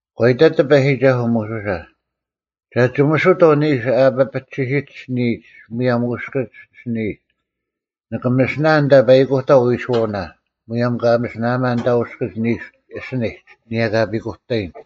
ᒂ ᐃᑕᑦ ᑎᐸᔨᒋᒐᓱᐤ ᒧᓱᓴ, “ᒐ ᒋᒥᓱᑥᐤ ᓂᓱ ᐊ ᐱᐱᒋᓯᒡ ᐊᓯᓂᔨᒡ ᒧᔭᒻ ᐅᔅᑭᒡ ᐊᓯᓂᔨᒡ, ᓂᑭ ᒥᓯᓇᐊᓐ ᐊᓐᑕ ᐸᐃᑯᑕᐤ ᐎᓱᐛᐅᓇ, ᒧᔭᒻ ᑲ ᒥᓯᐊᒪᓐ ᐊᓐᑕ ᐅᔅᑭᒡ ᓂᓱ ᐊᓯᓂᒡ, ᐊᓂᔭ ᑲ ᐱᑯᑕᔨᓐ᙮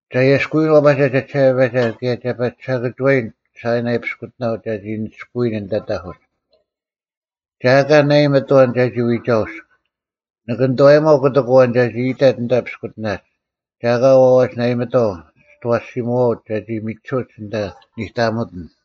ᒐ ᐊᔭᔅᑯᐎᔨᓐ ᐛᐸᒐ ᒐᒋᓴᐸᔭᒐ ᑭᔭ ᒐ ᐸᒋ ᓴᑭᒋᐛᔨᓐ ᓴᐃᓇᐃ ᐱᔅᑯᑎᓇᐤ ᒐᒋ ᓂᒋᔅᑯᐎᓐ ᐊᓐᑕ ᑕᐧᑯᒡ᙮ ᒐ ᐊᑲ ᓇᐃᒥᑦ ᐊᐛᓐ ᒐᒋ ᐎᒐᐅᔅᒄ, ᓇᒪ ᓂᑐᐛᔨᒪᐤ ᑯᑎᒃ ᐊᐛᓐ ᒐᒋ ᐃᑕᑦ ᐊᓐᑕ ᐱᔅᑯᑎᓇᒡ, ᒐ ᐊᑲ ᐊᐛᒡ ᓇᐃᒥᑥᐤ ᒋᑦ ᐊᐛᓯᓯᒧᐛᐅᒡ ᒐᒋ ᒥᒋᓱᐅᒡ ᐊᓐᑕ ᓂᑕᒥᑎᓐ᙮”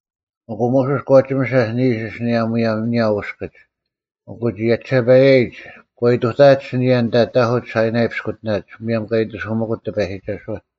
ᐊᑯ ᒧᓱᔅ ᒂ ᒋᒥᓴᐧᒃ ᓂᓱ ᐊᓯᓂᔭ ᒧᔭᒻ ᐊᓂᔭ ᐅᔅᑭᒡ, ᐊᑯ ᒋᔭᒋᓴᐸᔭᔨᒡ ᒂ ᐃᑐᑕᐊᑦ ᐊᓯᓂᔭ ᐊᓐᑕ ᑕᐧᑯᒡ ᓴᐃᓇᐃ ᐱᔅᑯᑎᓇᒡ, ᒧᔭᒻ ᑲ ᐃᑎᓱᒥᑯᑦ ᑎᐸᔨᒋᒐᓱᐛ᙮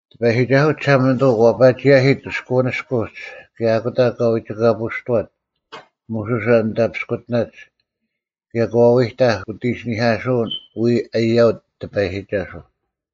ᑎᐸᔨᒋᒐᓱᐤ ᒋᓴᒪᓂᑐᐤ ᒂ ᐸᒋ ᔭᓯᑦ ᑭᔅᑯᐅᓂᔅᑯᒡ ᑭᔭ ᐊᑯᑕ ᒂ ᐎᒋᑲᐳᔅᑐᐛᑦ ᒧᓱᓴ ᐊᓐᑕ ᐱᔅᑯᑎᓇᒡ ᑭᔭ ᒂ ᐎᑕᐧᒃ ᐅᑦ ᐃᓯᓂᐧᑲᓱᐅᓐ ᐎᔾ ᐃᔭᐅᑦ ‘ᑎᐸᔨᒋᒐᓱᐤ’᙮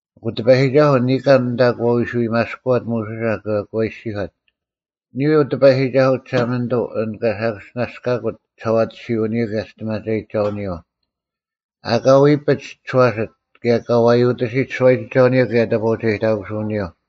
ᐊᑯ ᑎᐸᔨᒋᒐᓱᐤ ᓂᑲᓐ ᐊᓐᑕ ᒂ ᐃᓯ ᐎᒪᔅᑯᐛᑦ ᒧᓱᓴ ᑭᔭ ᒂ ᐃᔅᒋᔄᑦ, “ᓂᔾ ᐅ ᑎᐸᔨᒋᒐᓱᐤ ᒋᓴᒪᓂᑐᐤ ᐊᓐ ᑲ ᓴᑭᔅᒋᓇᔅᑲᑯᑦ ᒋᓴᐛᑎᓯᐅᓂᔪᐤ ᑭᔭ ᒋᔅᑎᒪᒐᔨᒋᒐᐅᓂᔪᐤ, ᐊᑲ ᐎᐱᒡ ᒋᔄᓯᑦ ᑭᔭ ᑲ ᐛᔪᑎᓯᑦ ᓱᐛᔨᒋᒐᐅᓂᔪᐤ ᑭᔭ ᑕᑈᐅᒐᔨᑕᑯᓱᐅᓂᔪᐤ᙮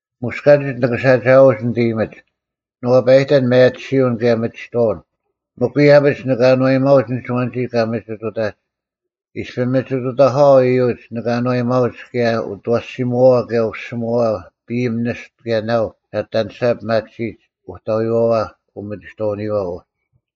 ᒧᔅ ᑲᒋᒡ ᓂᑭ ᓴᒋᐊᐎᒡ ᓂᑦ ᐃᔨᒥᒡ, ᓂ ᐛᐸᔨᑕᓐ ᒥᔭᑎᓯᐅᓐ ᑭᔭ ᒥᒋᑥᐅᓐ, ᒥᒄ ᐃᔭᐱᒡ ᓂᑭ ᐊᓏᔨᒪᐅᒡ ᐊᓐ ᐊᐛᓐᒋ ᑲ ᒥᒋᑐᑕᒡ᙮ ᐃᔅᐱ ᒥᒋᑐᑕᒂᐛ ᐃᔪᒡ ᓂᑭ ᐊᓏᔨᒪᐅᒡ ᑭᔭ ᐅᑦ ᐊᐛᓯᒧᐛᐛ ᑭᔭ ᐅᓯᒧᐛᐛ ᐱᐃᒻ ᓂᔅᑐ ᑭᔭ ᓇᐤ ᒐ ᐊᑎ ᐊᓂᔅᒐ ᐱᒪᑎᓯᒡ ᐅᑕᐎᐛᐛ ᐅᒥᒋᑥᐅᓂᔨᐛ ᐅᒋ᙮”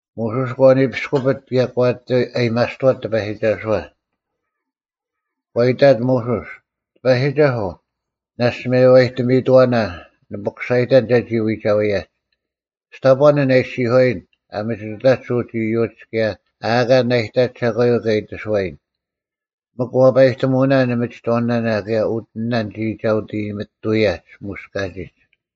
ᒧᓱᔅ ᒂ ᓂᐱᔅᑯᐱᑦ ᑭᔭ ᒂ ᐊᑎ ᐊᔭᒥᐊᔅᑐᐛᑦ ᑎᐸᔨᒋᒐᓱᐛ᙮ ᒂ ᐃᑕᑦ ᒧᓱᔅ, “ᑎᐸᔨᒋᒐᓱᐤ, ᓇᔅᒡ ᒪᔽᔨᑎᒥᑐᐛᓇ, ᓂ ᐱᑯᓴᔨᑕᓐ ᒐᒋ ᐎᒐᐎᔭᒡ᙮ ᒋ ᑕᑈᓐ ᐊᓐ ᐊ ᐃᔅᒋᔄᔨᓐ ᐊ ᒥᒋᑐᑕᒡ ᐅᒡ ᐃᔪᒡ ᑭᔭ ᐊ ᐊᑲ ᓇᐃᑕᒡ ᒐᒂᔪᐤ ᑲ ᐃᑎᓱᐛᔨᓐ, ᒥᒄ ᐛᐸᔨᑎᒧᐅᓇᓐ ᓂᒥᒋᑥᐅᓇᓇ ᑭᔭ ᐅᑎᓂᓇᓐ ᒋᔾ ᒐ ᐅᑦ ᐃᔨᒥᑐᐅᔭᒡ ᒧᔅ ᑲᒋᒡ᙮”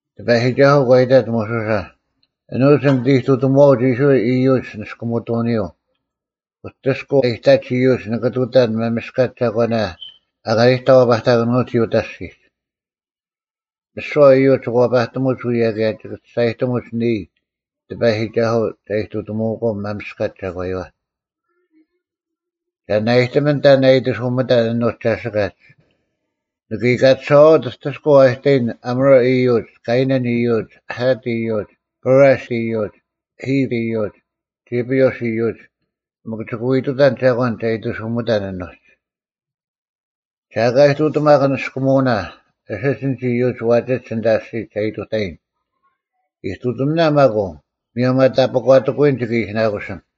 ᑎᐸᔨᒋᒐᓱᐤ ᒂ ᐃᑕᑦ ᒧᓱᓴ, “ᐊᓄᒡ ᓂ ᐃᑐᑎᒧᐛᐅᒡ ᐃᔅᕋᐃᓪ ᐃᔪᒡ ᓂᔅᑯᒥᑐᐅᓂᔪᐤ, ᐅᑎᔅᑯᐤ ᐊᔨᑕᒡ ᐃᔪᒡ ᓂᑭ ᑐᑕᓐ ᒪᒥᔅᑲᒡ ᒐᒂᓇ ᐊᑲ ᓂᑕ ᐛᐸᑕᑭᓄᐅᒋ ᐅᑕ ᐊᔅᒋᒡ᙮ ᒥᓯᐛ ᐃᔪᒡ ᒋᑭ ᐛᐸᑎᒧᒡ ᐅᔭ ᑭᔭ ᒋᑭ ᒋᔅᒐᔨᑎᒧᒡ ᓂᔾ, ᑎᐸᔨᒋᒐᓱᐤ, ᒐ ᐃᑐᑎᒧᐅᒂᐤ ᒪᒥᔅᑲᒡ ᒐᒂᔪᐛ᙮ ᒐ ᓂᓇᐃᑎᒥᓐ ᑕᓐ ᐊᐃᑎᓱᒥᑕᓐ ᐊᓄᒡ ᒐᓯᑲᒡ᙮ ᓂᑭ ᐃᑲᑎᓴᐛᐅᒡ ᐅᑎᔅᑯᐤ ᐊᐃᑕᔨᓐ ᐊᒧᕆ ᐃᔪᒡ, ᑲᐃᓇᓐ ᐃᔪᒡ, ᐊᑦ ᐃᔪᒡ, ᐸᕆᔅ ᐃᔪᒡ, ᐃᑉ ᐃᔪᒡ, ᒐᐱᐅᔅ ᐃᔪᒡ, ᒥᒄ ᒋᑭ ᐎ ᑐᑕᓐ ᒐᒂᓐ ᒐ ᐃᑎᓱᒥᑕᓐ ᐊᓄᒡ᙮ ᒐ ᐊᑲ ᐃᑐᑎᒪᒄ ᓂᔅᑯᒧᐅᓇ ᐊᓯᒡ ᐊᓐᒡ ᐃᔪᒡ ᐛᒋᒡ ᐊᓐᑕ ᐊᔅᒋᒡ ᒐ ᐃᑐᑕᔨᓐ᙮ ᐃᑐᑎᒥᓇ ᒪᒃ ᐅ, ᒧᔭᒻ ᐊ ᑕᐱᒂᑎᑯᐎᔨᓐ ᒋᑭ ᐃᓯᓇᑯᓐ᙮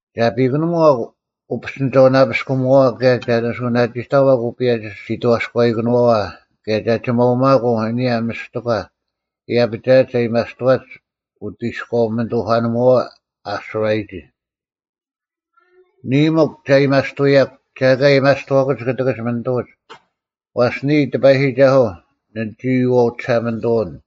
ᒐ ᐱᑯᓂᒺᒄ ᐅᐱᔅᑎᓂᒐᐅᓇᐱᔅᑯᒧᐛᐛ ᑭᔭ ᒐ ᓂᓱᐅᓇᒋᑕᐛᒄ ᐅᐸᔭᒋ ᓯᑥᔅᑲᐃᑭᓄᐛᐛ ᑭᔭ ᒐ ᒋᒪᐅᒪᑯᐤ ᐊᓂᔭ ᒥᔅᑎᒂ ᐃᔭᐱᒐᐊᒡ ᐊᔭᒥᐊᔅᑐᐛᒡ ᐅᑦ ᐃᔎᐅ-ᒥᓂᑐᐧᑲᓂᒧᐛᐛ ᐊᓱᕋᔨᒋ᙮ ᓂᔾ ᒥᒄ ᒐ ᐊᔭᒥᐊᔅᑐᐅᔭᒄ, ᒐ ᐊᑲ ᐊᔭᒥᐊᔅᑐᐛᑯᒡ ᑯᑎᑭᒡ ᒥᓂᑐᐅᒡ, ᐛᔅ ᓂᔾ ᑎᐸᔨᒋᒐᓱᐤ ᓂ ᒋᔨᐛᐤ ᒋᓴᒪᓂᑐᐅᓐ᙮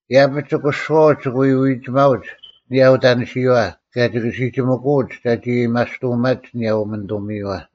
ᐃᔭᐱᒡ ᒋᑯᓱᐛᐅᒡ ᒋᑭ ᐎ ᐎᒋᒪᐅᒡ ᐊᓂᔭ ᐅᑕᓂᓯᔨᐛ ᑭᔭ ᒋᑭ ᓯᒋᒥᑯᐅᒡ ᒐᒋ ᐊᔭᒥᐊᔅᑐᐅᒪᒡ ᐊᓂᔭ ᐅᒥᓂᑐᐅᒥᔪᐛ᙮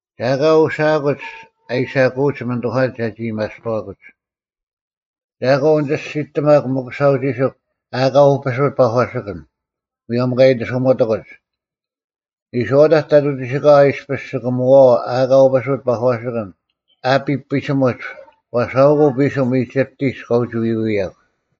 ᒐ ᐊᑲ ᐅᓯᐊᑯᒡ ᐊ ᐃᓴᑯᐅᒡ ᒥᓂᑐᐧᑲᓐᒡ ᒐᒋ ᐊᔭᒥᐊᔅᑐᐛᑯᒡ᙮ ᒐ ᐊᑲ ᐅᓂᒋᔅᒋᑎᒪᒄ ᒥᑯᓴᐤ ᒋᓯᒄ ᐊᑲ ᐅᐱᓱᑦ ᐸᒂᓯᑭᓐ, ᒧᔭᒻ ᑲ ᐃᑎᓱᒥᑎᑯᒡ᙮ ᓂᔄᐅᑕᒡ ᑕᑐᐤ ᒋᓯᑲᐛ ᐃᔅᐱᔅ ᒋᑭ ᒧᐛᐛᐤ ᐊᑲ ᐅᐱᓱᑦ ᐸᒂᓯᑭᓐ ᐊᐱᑉ ᐱᓯᒧᒡ ᐛᔅ ᐊᐅᑯᐤ ᐱᓯᒻ ᐃᒋᑉᑎᒡ ᑲ ᐅᒋ ᐎᐎᔭᒄ᙮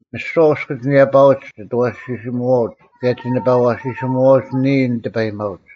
ᒥᓯᐛ ᐅᔅᑭᒡ ᓂᔭᐸᐅᒡ ᒋᑦ ᐊᐛᓯᓯᒧᐛᐅᒡ ᑭᔭ ᒋᓇᐸ ᐊᐛᓯᓯᒧᐛᐅᒡ ᓂᔾ ᓂ ᑎᐸᔨᒪᐅᒡ᙮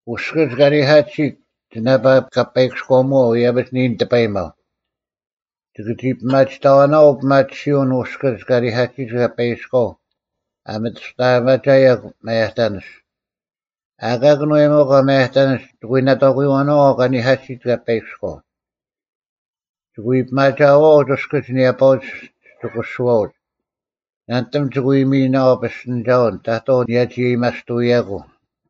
ᐅᔅᑭᒡ ᑲᓂᐧᑲᑎᓯᑦ ᒋᓇᐸ ᑲᐸᐃᑭᔎᒧᐛᐤ ᐃᔭᐱᒡ ᓂᔾ ᓂᑎᐸᔨᒪᐤ᙮ ᒋᑭ ᒋ ᐱᒪᒋᑕᐛᓇᐛᐤ ᐅᐱᒪᑎᓯᔪᐅᓐ ᐅᔅᑭᒡ ᑲᓂᐧᑲᑎᓯᑦ ᑲᐸᐃᑭᔎᐤ ᐊ ᒥᑐᔅᑕᐊᒪᒐᔭᒄ ᒪᔭᑕᓂᔅ᙮ ᐊᑲ ᑭᓄᐛᔨᒪᒂ ᒪᔭᑕᓂᔅ ᒋᑭ ᐎ ᓇᑥᑯᐎᐛᓇᐛᐤ ᑲᓂᐧᑲᑎᓯᑦ ᑲᐸᐃᑭᔎᐤ᙮ ᒋᑭ ᐎ ᐱᒪᒐᐛᐅᒡ ᐅᔅᑭᒡ ᓂᔭᐸᐅᒡ ᒋᑯᓱᐛᐅᒡ᙮ ᓇᓂᑎᒻ ᒋᑭ ᐎ ᒥᔨᓇᐛᐤ ᐱᔅᑎᓂᒐᐅᓐ ᑕᑥᐤ ᓂᔭᒋ ᐊᔭᒥᐊᔅᑐᐎᔭᑯᐤ᙮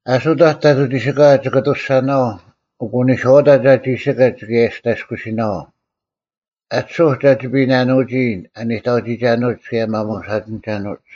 ᐊᓱᑕᒡ ᑕᑐᐤ ᒋᓯᑲᐛ ᒋᑭ ᐊᑐᔅᒐᓇᐛᐤ ᐊᑯ ᓂᔄᐅᑕᒡ ᐊ ᒋᓯᑲᒡ ᒋᑭ ᐊᔭᔅᑕᔅᑯᓯᓇᐛᐤ᙮ ᐊᑎᓱᐧᒄ ᒐ ᒋᐱᓇᓄᒋ ᐊ ᓂᑕᐅᒋᒐᓄᐅᒡ ᑭᔭ ᐊ ᒪᒧᓴᒋᓇᑭᓄᐅᒡ᙮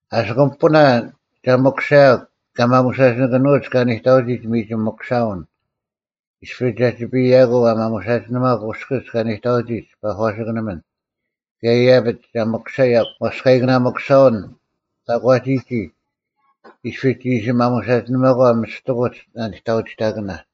ᐊᓯᑯᒻ ᐱᐳᓇ ᒐ ᒥᑯᓴᔭᒄ ᑲ ᒪᒧᓴᒋᓂᑭᓄᐅᒡ ᑲ ᓂᑕᐅᒋᒡ ᒥᒋᒻ ᒥᑯᓴᐅᓐ ᐃᔅᐱ ᒐᒋᐱᔭᑯᐤ ᐊ ᒪᒧᓴᒋᓂᒪᒄ ᐅᔅᑭᒡ ᑲ ᓂᑕᐅᒋᒡ ᐸᒂᓯᑭᓂᒥᓐ ᑭᔭ ᐃᔭᐱᒡ ᒐ ᒥᑯᓴᔭᒄ ᐛᔅᑲᐃᑭᓇ ᒥᑯᓴᐅᓐ ᑕᒂᒋᒋ ᐃᔅᐱ ᒋ ᐃᓯ ᒪᒧᓴᒋᓂᒪᒂ ᒥᔅᑎᑯᒡ ᓂᑕᐅᒋᑕᑭᓇ᙮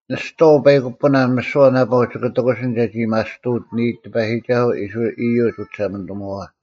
ᓂᔍᐤ ᐸᐃᑯᐳᓇ ᒥᓯᐛ ᓇᐸᐤ ᒋᑭ ᑎᑯᓯᓐ ᒐᒋ ᐊᔭᒥᐊᔅᑐᐅᑦ ᓂᔾ ᑎᐸᔨᒋᒐᓱᐤ ᐃᔅᕋᐃᓪ ᐃᔪᒡ ᐅᒋᓴᒪᓂᑐᒧᐛᐛ᙮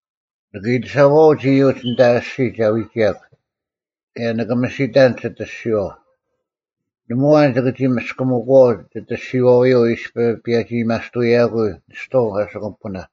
ᓂᑭ ᐃᑲᑎᓴᐛᐅᒡ ᐃᔪᒡ ᐊᓐᑕ ᐊᔅᒋᒡ ᒐ ᐎᒋᔭᒄ ᑭᔭ ᓂᑭ ᒥᓯᑕᓐ ᒋᑦ ᐊᔅᒋᐛᐤ, ᓇᒪ ᐊᐛᓐ ᒋᑭ ᒋ ᒥᔅᑭᒥᑯᐛᐤ ᒋᑦ ᐊᔅᒋᐛᐅᔪᐤ ᐃᔅᐱ ᐸᒋ ᐊᔭᒥᐊᔅᑐᔭᑯᐤ ᓂᔍᐤ ᐊᓯᑯᒻ ᐱᐳᓇ᙮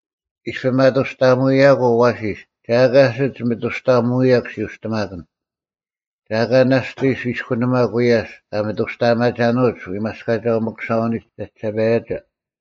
ᐃᔅᐱ ᒪᑐᔅᑕᒧᐅᔭᑯᐤ ᐊᐛᓯᔅ ᒐ ᐊᑲ ᐊᓯᒡ ᒥᑐᔅᑕᐊᒧᐅᔭᒄ ᓯᐅᔅᑎᒪᑭᓐ᙮ ᒐ ᐊᑲ ᓇᔅᑎᔅ ᐃᔅᑯᓂᒪᒄ ᐎᔭᔅ ᑲ ᒥᑐᔅᑕᐊᒪᒐᓄᐅᒡ ᐎᒪᔅᑲᒐᐤ ᒥᔅᑯᓴᐅᓂᒡ ᒐᒋᓴᐸᔭᒐ᙮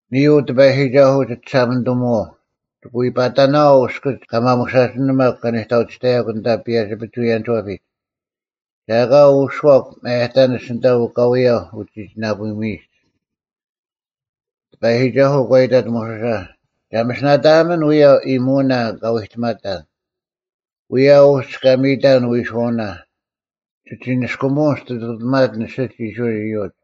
ᓂᔾ ᐅ ᑎᐸᔨᒋᒐᓱᐤ ᒋᒋᓴᒪᓂᑐᒧᐛᐤ᙮ ᒋᑭ ᐎ ᐸᑕᓇᐛᐤ ᐅᔅᑭᒡ ᑲ ᒪᒧᓴᒋᓂᒪᒄ ᑲᓂᑕᐅᒋᑕᔭᒄ ᐊᓐᑕ ᐸᔭᒋ-ᐱᒍᐎᔭᓂᒋᐛᐱᒡ, ᒐ ᐊᑲ ᐅᓱᐛᒃ ᒪᔭᑕᓂᔅ ᐊᓐᑕ ᐅᑲᐎᔭ ᐅᒋᒋᓇᐳᒥᔨᒡ᙮” ᑎᐸᔨᒋᒐᓱᐤ ᒂ ᐃᑕᑦ ᒧᓱᓴ, “ᒐ ᒥᓯᓇᑕᐊᒥᓐ ᐅᔭ ᐃᔨᒧᐅᓇ ᑲ ᐎᑎᒪᑕᓐ᙮ ᐅᔭ ᐅᒡ ᑲ ᒥᔨᑕᓐ ᐎᓱᐛᐅᓇ, ᒋᒋ ᓂᔅᑯᒧᐅᓐ ᒋ ᐃᑐᑎᒪᑎᓐ ᐊᓯᒡ ᐃᔅᕋᐃᓪ ᐃᔪᒡ᙮”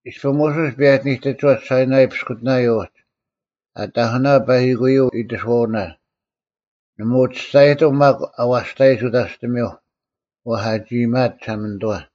ᐃᔅᐱ ᒧᓱᔅ ᐱᔭᒋ ᓂᑎᒋᐛᑦ ᓴᐃᓇᐃ ᐱᔅᑯᑎᓇᔪᐤ ᐅᒡ, ᐊ ᑕᐧᑯᓇᐧᒃ ᐸᐃᑯᔪᐤ ᐃᑎᓱᐛᐅᓇ, ᓇᒪ ᐅᒋ ᒋᔅᒐᔨᑎᒻ ᒪᒃ ᐊᐛᔅᑕᔨᒡ ᐅᑕᔅᑎᒥᐧᒄ ᐛᔅ ᐊᒋ ᐃᔨᒪᐊᑦ ᒋᓴᒪᓂᑐᐛ᙮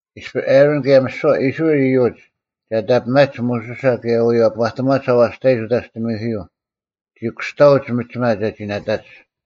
ᐃᔅᐱ ᐊᕋᓐ ᑭᔭ ᒥᓯᐛ ᐃᔅᕋᐃᓪ ᐃᔪᒡ ᒐ ᑕᐱᒪᒡ ᒧᓱᓴ ᑭᔭ ᐎᔭᐸᑎᒺᒡ ᐊᐛᔅᑕᔨᒡ ᐅᑕᔅᑎᒥᐧᑯᔪᐤ, ᒋ ᑯᔅᑕᐅᒡ ᒥᒋᒪ ᒐᒋ ᓇᑕᒡ᙮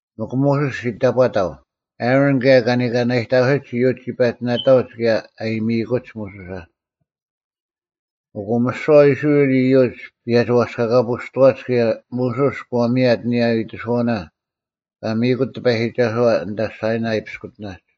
ᒥᒄ ᒧᓱᔅ ᒋ ᑕᑈᑕᐤ, ᐊᕋᓐ ᑭᔭ ᑲ ᓂᑲᓇᔨᑕᑯᓯᒡ ᐃᔪᒡ ᒋ ᐸᒋ ᓇᑕᐅᒡ ᑭᔭ ᐊ ᐃᔨᒥᑯᒡ ᒧᓱᓴ᙮ ᐊᑯ ᒥᓯᐛ ᐃᔅᕋᐃᓪ ᐃᔪᒡ ᐱᔭᒋ ᐛᔅᑲᑲᐳᔅᑐᐛᒡ ᑭᔭ ᒧᓱᔅ ᒂ ᒥᔭᑦ ᐊᓂᔭ ᐃᑎᓱᐛᐅᓇ ᑲ ᒥᔨᑯᑦ ᑎᐸᔨᒋᒐᓱᐛ ᐊᓐᑕ ᓴᐃᓇᐃ ᐱᔅᑯᑎᓇᒡ᙮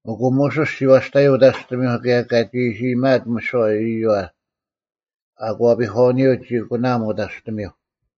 ᐊᔅᒄ ᒧᓱᔅ ᒋ ᐛᔅᑕᔪᐤ ᐅᑕᔅᑎᒥᐧᒄ ᑭᔭ ᑲᒋ ᐃᓯ ᐃᔨᒪᐊᑦ ᒧᓱᔅ ᐃᔪᐛ, ᐊᑯᐛᐱᒂᐅᓂᔪᐤ ᒋ ᐊᑯᓇᐊᒻ ᐅᑕᔅᑎᒥᐧᒄ᙮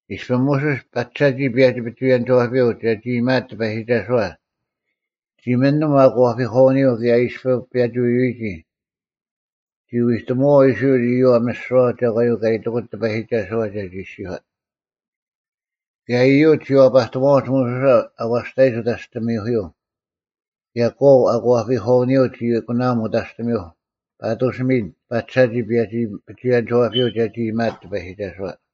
ᐃᔅᐱ ᒧᓱᔅ ᐸᒐᒋ ᐸᔭᒋ-ᐱᒍᐎᔭᓂᒋᐛᐱᔪᐤ ᒐᒋ ᐃᔨᒪᐊᑦ ᑎᐸᔨᒋᒐᓱᐛ, ᒋ ᒥᓂᒻ ᐊᑯᐛᐱᒂᐅᓂᔪᐤ ᑭᔭ ᐃᔅᐱ ᐸᒋ ᐎᐎᔨᒋ, ᒋ ᐎᑎᒧᐛᐤ ᐃᔅᕋᐃᓪ ᐃᔪᐛ ᒥᓯᐛ ᒐᒂᔪᐤ ᑲ ᐃᑎᑯᑦ ᑎᐸᔨᒋᒐᓱᐛ ᒐᒋ ᐃᔅᒋᔄᑦ᙮ ᑭᔭ ᐃᔪᒡ ᒋ ᐛᐸᑎᒺᐅᒡ ᒧᓱᓴ ᐊᐛᔅᑕᔨᒡ ᐅᑕᔅᑎᒥᐧᑯᔪᐤ ᑭᔭ ᑲᐤ ᐊᑯᐛᐱᒂᐅᓂᔪᐤ ᒋ ᐊᑯᓇᐊᒻ ᐅᑕᔅᑎᒥᐧᒄ ᐸᑐᔅ ᒥᓐ ᐸᒐᒋ ᐸᔭᒋ-ᐱᒍᐎᔭᓂᒋᐛᐱᔪᐤ ᒐᒋ ᐃᔨᒪᐊᑦ ᑎᐸᔨᒋᒐᓱᐛ᙮